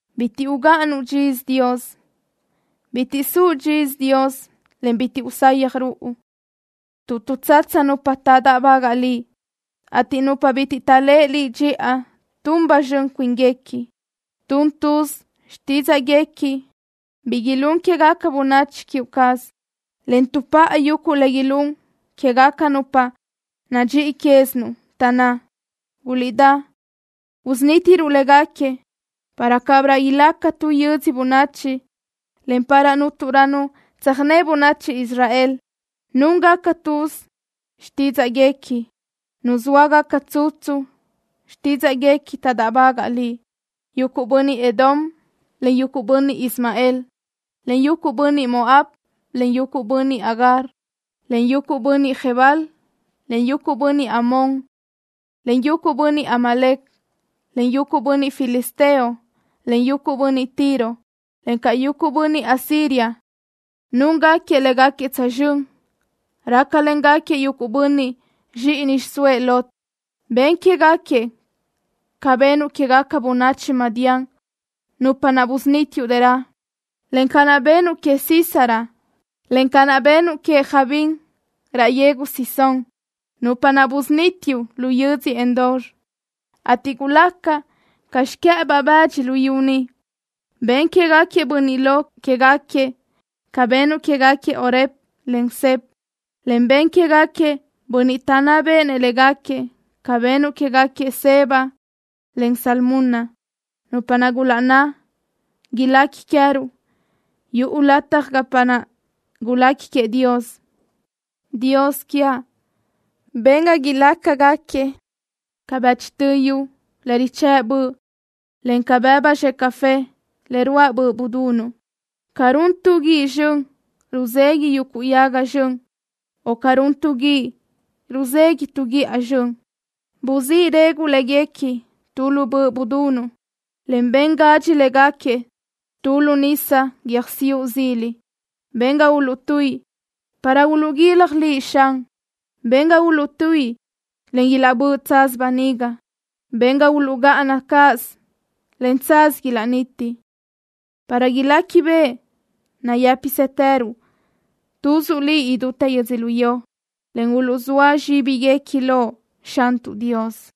Bitiʼ ugáʼanuʼ dxisö, Dios. Bitiʼ suʼ dxisö, Dios, en bitiʼ usayaj ruʼu, tuʼ tuʼtsatsa nupa taʼdáʼbagaʼ Liʼ, ateʼ nupa bitiʼ taʼléʼe Liʼ dxiʼa tun ba zxön cuínguequi. Tun tuz xtídzaʼguequi bi ilún quégaca bönachi queë cazuʼ, en tuʼpá yuguʼ le ilún quégaca nupa nadxíʼi quézinuʼ, taʼnná: “Guliʼdá, usunítiruʼ léguequi para cabirö ilaca tu yödzö bönachi, en para cúnturö nu tsöjné bönachi Israel.” Núngaca tuz xtídzaʼguequi. Nuzóagaca tsutsu xtídzaʼguequi taʼdáʼbagaʼ Liʼ. Yuguʼ bönniʼ Edom, en yuguʼ bönniʼ Ismael, en yuguʼ bönniʼ Moab, en yuguʼ bönniʼ Agar, en yuguʼ bönniʼ Gebal, en yuguʼ bönniʼ Amón, en yuguʼ bönniʼ Amalec, en yuguʼ bönniʼ Filisteo, en yuguʼ bönniʼ Tiro, encaʼ yuguʼ bönniʼ Asiria núngaquiëʼ légaquiëʼ tsözxö́n. Rácalengaquiëʼ yuguʼ bönniʼ zxíʼini xiʼsóëʼ Lot. Ben quégaquiëʼ ca benuʼ quégaca bönachi Madián, nupa naʼ busunítiuʼ dërö, en ca naʼ benuʼ queëʼ Sísara, en ca naʼ benuʼ queëʼ Jabín raʼ yegu Cisón, nupa naʼ busunítiuʼ lu yödzö Endor, ateʼ gulaca ca xiquë́ʼëbaʼ bëdxi luyú niʼ. Ben quégaquiëʼ bönniʼ lo quéguequi ca benuʼ quégaquiëʼ Oreb, en Zeb, en ben quégaquiëʼ bönniʼ taʼnná béʼenëʼ léguequi ca benuʼ quégaquiëʼ Zeba, en Zalmuna, nupa naʼ gulaʼnná: “Ilequi queë́ruʼ yuguʼ lataj gapa naʼ gulequi queëʼ Dios.” Dios quiaʼ, ben ga ilácagaquiëʼ ca bëchtö yu le richë́ʼ böʼ, en ca bëbu zxe café le ruáʼ böʼ budunuʼ. Ca run tu guíʼ zxön, ruzeguiʼ yuguʼ yaga zxön, o ca run tu guíʼ, ruzeguiʼ tu guíʼa zxön, gusí reguʼ léguequi tu lu böʼ budunuʼ, en ben gadxi léguequi tu lu nisa guiö́jsiuʼ zili. Ben ga uluʼtuíʼi para uluʼguilaj Liʼ, Xan. Ben ga uluʼtuíʼi, en ilaʼbö́ʼ tsaz böniga. Ben ga uluʼgáʼana cáʼasö, en tsaz ilaʼniti, para iléquibeʼe nayë́pisëtëruʼ tuzuʼ Liʼ idútë yödzölió en uluʼzóa zxíbiguequi loʼ, Xantuʼ Dios.